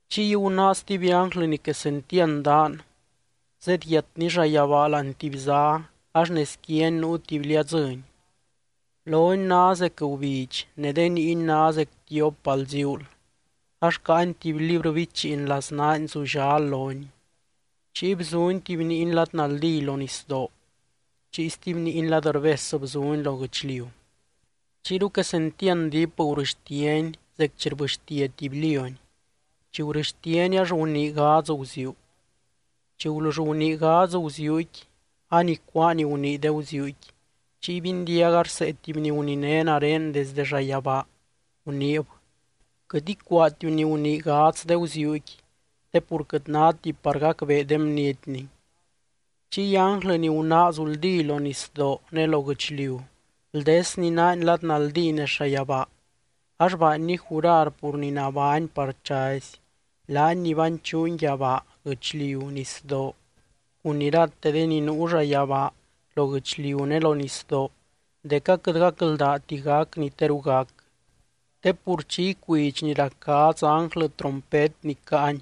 Chiy gunáa stuby ánglɨ ni quesentiand daan, zedyiatny llayabaa láani tuby zá ax nez quiany nuu tuby liadzɨ́ny. Lony ná zec gubidx ne de niiny ná zec tiop bal ziuul, ax caany tuby librɨ bichiin laznaany zullal loni. Chiy bzuny tuby niiny lad naldí lo nisdoo, chiy stuby niiny lad rbes bzuny lo guɨchliu. Chiyru quesentiand diip gurɨxtiany zec chi rbɨxtia tuby lióny, chi gurɨxtiany ax gunii gadz guziuu. Chi gulull gunii gadz guziuuqui, anicuáa ni gunii de guziuuqui, chiy bindiaga rsee tuby ni guniné nare desdɨ llayabaa, guniib: —Quɨt icuaatiu ni gunii gadz de guziuuqui, te pur quɨt náti par gacbee de bnietni. Chiy ánglɨ ni gunáa zuldí lo nisdoo ne lo guɨchliu bldesny naany lad naldí nez llayabaa, ax baanny jurar pur ni nabány par chazy, laany ni banchuuny yabaa, guɨchliu, nisdoo, cun irate de ni nuu llayabaa, lo guɨchliu ne lo nisdoo dec aquɨt gacldaati gac ni teru gac. Te pur chi icuidx ni rac gadz ánglɨ trompet ni caany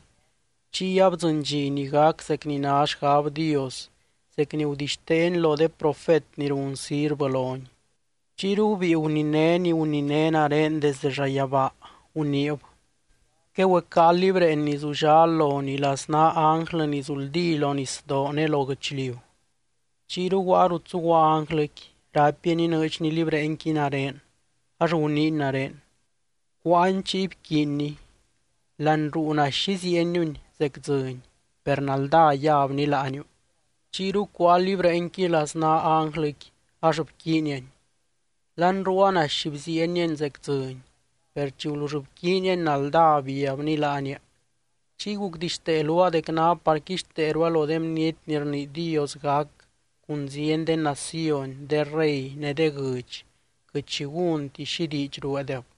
chiy abdzɨny dxi ni gac zec ni ná xgab Dios, zec ni gudixteeny lo de profet ni run sirvɨ lony. Chiyru gubíi guniné ni guniné nare desde llayabaa, guniib: —Quegüecáa libreen ni zullal lonii laznaa ánglɨ ni zuldí lo nisdoo ne lo guɨchliu. Chiyru guaa rut zuguaa ánglɨqui, raipiany inɨɨdxny libreenqui nare, ax guniiny nare: —Cuáani chiy bquiinni. Láani ruu naxy iziieniuni zec dzɨny, per naldá yabni láaniu. Chiyru cuáa libreenqui laznaa ánglɨqui, ax bquiiniani. Láani ruua naxy bziieniani zec dzɨny, per chi gulull bquiiniani naldá biabni láania. Chiy gucdixtee luaa dec ná par quixteerua lo de bniety ni rnii Dios gac cun zieny de naciony, de rey ne de guɨdx, quɨt xi gúnti xi diidx rueedeb.